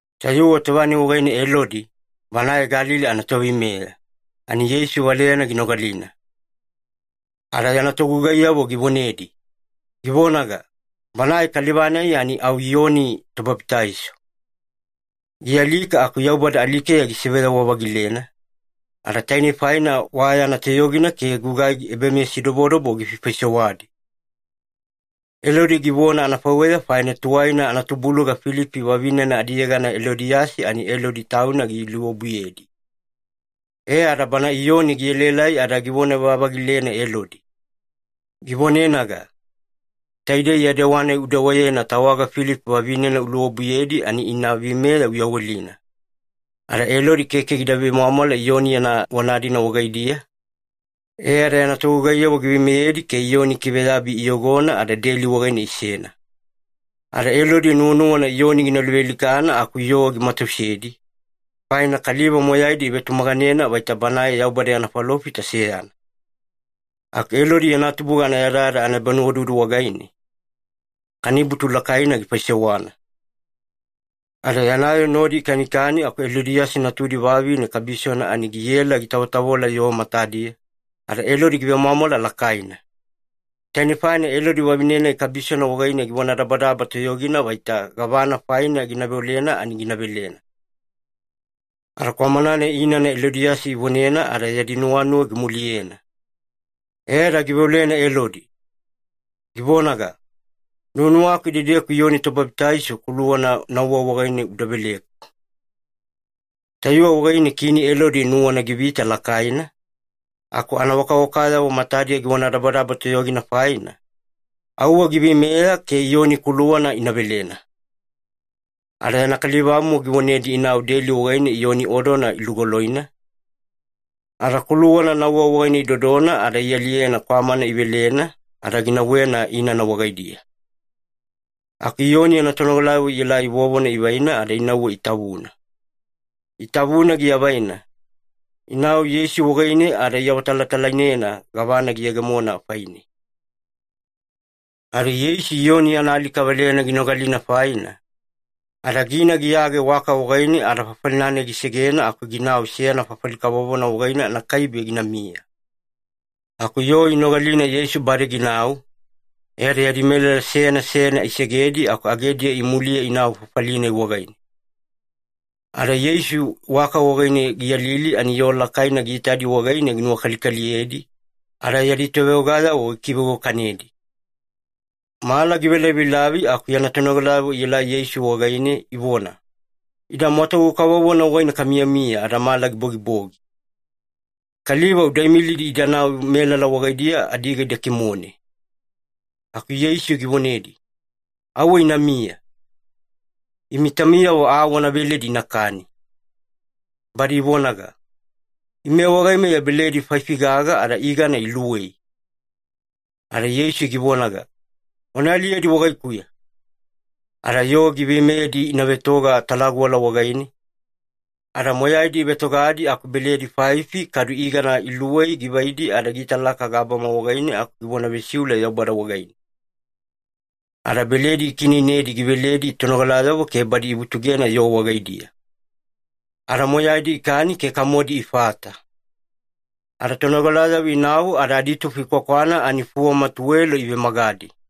Tayuwe tova-nai wagaine Elodi, banae Galili anatoveimeya, ani Yeisu valeyana ginogalina. Ada yana togugaiyavo givonedi, givonaga, “Banae kaliva-nai ani au Iyoni Tobabitaiso. Gialika aku Yaubada alikeya gisiveyawa-vagilena, ada tainei faina wa yana toyogina ke gugai ebameyasidobodobo gifaifaisewadi.” Elodi givona anafaiweya faina tuwaina anatubuluga Filipi vavinena adiyegana Elodiyasi, ani Elodi tauna giluobuyedi. E ada bana Iyoni gielaelai ada givona-vavagilena Elodi, givonenaga, “Taidei ya dewa-nai udewayena tawaga Filipi vavinena uluobuyedi ani ina veimeya uyawelina.” Ada Elodi keke gida vemwamwala Iyoni yana vona-dina wagaidiya, e ada yana togugaiyavo giveimeyedi ke Iyoni ikiveyabi iyogona ada deli wagaine isena. Ada Elodi nuwanuwana Iyoni gina luvealikana aku yoo gimatausedi, faina kaliva moyaidi ivetumaganena vaita banae Yaubada yana falofita seyana. Aku Elodi yana tubuga anayadayada anaebanuwaududu wagaine, kanibutu lakaina gifaisewana. Ada yana yoo nodi ikanikani aku Elodiyasi natudi vavine kabisona ani giela gitavotavola yoo matadiya, ada Elodi givemwamwala lakaina. Taine faina Elodi vavine-nai kabisona wagaine givonadabadaba toyogina vaita gavana faina gina veolena ani gina velena. Ada kwamana-nai inana Elodiyasi ivonena ada yadi nuwanuwa gimuliyena, e ada giveolena Elodi, givonaga, “Nuwanuwaku idedeku Iyoni Tobabitaiso kuluwana nauwa wagaine uda veleku.” Tayuwe wagaine Kini Elodi nuwana givita lakaina, aku anawakawakayavo matadiya givonadabadaba toyogina faina, auwe giveimeya ke Iyoni kuluwana ina velena. Ada yana kalivamomo givonedi inau deli wagaine Iyoni odona ilugoloina, ada kuluwana nauwa wagaine idodona ada ialiyena kwamana ivelena, ada ginauwena inana wagaidiya. Aku Iyoni yana tonogalayavo ielai vovona ivaina ada inauwe itavuna. Itavuna giavaina, inau Yeisu wagaine ada iawatalatalainena gavana giyegemona faine. Ada Yeisu Iyoni yana alika valeyana ginogalina faina, ada gina giyage waka wagaine ada fafali-nai gisegena aku ginau seyana fafali kavovona wagaine anakaibe ginamiya. Aku yoo inogalina Yeisu bade ginau, e ada yadi melala seyana seyana isegedi aku agediya imuliye inau fafali-nai wagaine. Ada Yeisu waka wagaine giyalili ani yoo lakaina giitadi wagaine ginuwakalikaliyedi, ada yadi toveogayavo gikiveiwakanedi. Mala givelavilavi aku yana tonogalayavo ielai Yeisu wagaine ivona, “Ida mwatugu kavovona wagaine kamiyamiya ada mala gibogibogi. Kaliva uda imilidi idanau melala wagaidiya adiga ida kimone.” Aku Yeisu givonedi, “Auwe inamiya. Imi taumiyavo aa wana veledi inakani.” Badi ivonaga, “Ime wagaimeya beledi faifi-gaga ada igana iluwei.” Ada Yeisu givonaga, “Wana aliyedi wagaikuya.” Ada yoo giveimeyedi ina vetoga talaguwala wagaine, ada moyaidi ivetogadi aku beledi faifi kadu igana iluwei givaidi ada giitalaka gabama wagaine aku givona vesiule Yaubada wagaine. Ada beledi gikiineinedi giveledi tonogalayavo ke badi ivutugena yoo wagaidiya. Ada moyaidi ikani ke kamodi ifata. Ada tonogalayavo inau ada aditufo ikwakwana ani fuwama tuwelo ivemagadi.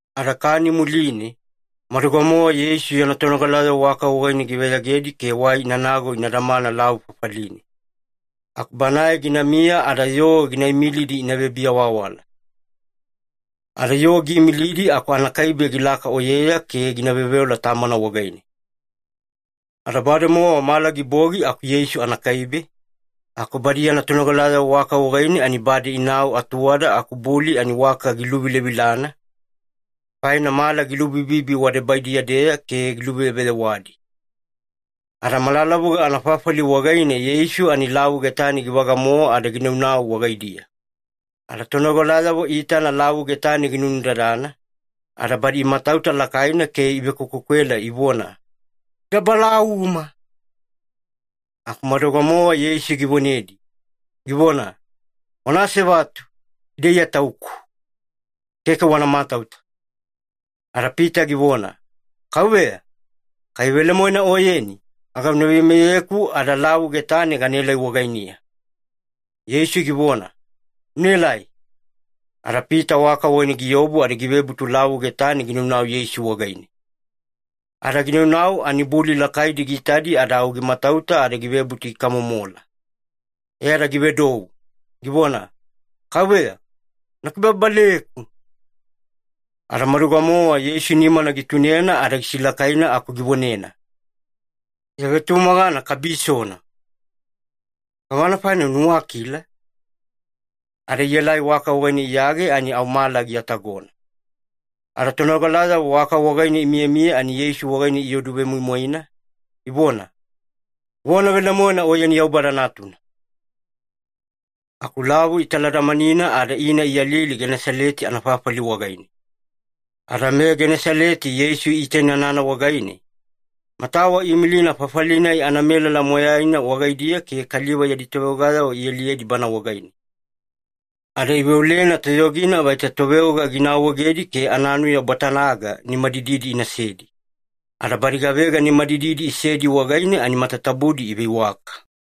Ada kani muline, maduga-mowa Yeisu yana tonogalayavo waka wagaine giveyagedi ke wai inanago ina damana lavu fafaline. Aku Banae ginamiya ada yoo gina imilidi ina vebiawaawala. Ada yoo giimilidi aku anakaibe gilaka oyeya ke gina veoveola Tamana wagaine. Ada bademowa mala gibogi aku Yeisu anakaibe, aku badi yana tonogalayavo waka wagaine ani bade inau atuwada aku buli ani waka giluvilavilana, faina mala gilubibibi wadebaidiya-deya ke giluveyeveyewadi. Ada malalavuga anafafali wagaine Yeisu ani lavu getane givaga-mowa ada ginaunau wagaidiya. Ada tonogalayavo iitana lavu getane ginunudadana, ada badi imatauta lakaina ke ivekwekwekwela ivona, “Ida balauma!” Aku maduga-mowa Yeisu givonedi, givona, “Wana asevatu. Ida Iya Tauku. Keke wana matauta.” Ada Pita givona, “Kauveya, kai velemoena Oyeni, aga una veimeyeku ada lavu getane ganaelai wagainiya.” Yeisu givona, “Unaelai.” Ada Pita waka wagaine giobu ada givebutu lavu getane ginaunau Yeisu wagaine. Ada ginaunau ani buli lakaidi giitadi ada au gimatauta ada givebutu gikamomola, e ada givedou, givona, “Kauveya, una kibababaleku!” Ada maduga-mowa Yeisu nimana gitunena ada gisilakaina aku givonena, “Ya vetumagana kabisona. Gavana faina unuwakila?” Ada ielai waka wagaine iyage ani au mala giatagona. Ada tonogalayavo waka wagaine imiyamiya ani Yeisu wagaine ioduvemoimoina, ivona, “Vona velemoena Oyeni Yaubada Natuna.” Aku lavu italadamanina ada ina iyalili Genesaleti anafafali wagaine. Ada meGenesaleti Yeisu iitainanana wagaine, matawa iimilina fafali-nai anamelala moyaina wagaidiya ke kaliva yadi toveogayavo ialiyedi Bana wagaine. Ada iveolena toyogina vaita toveoga gina awaegedi ke ananuya bwatana-ga nimadididi inasedi, ada badi gavega nimadididi isedi wagaine ani matatabudi iveiwaka.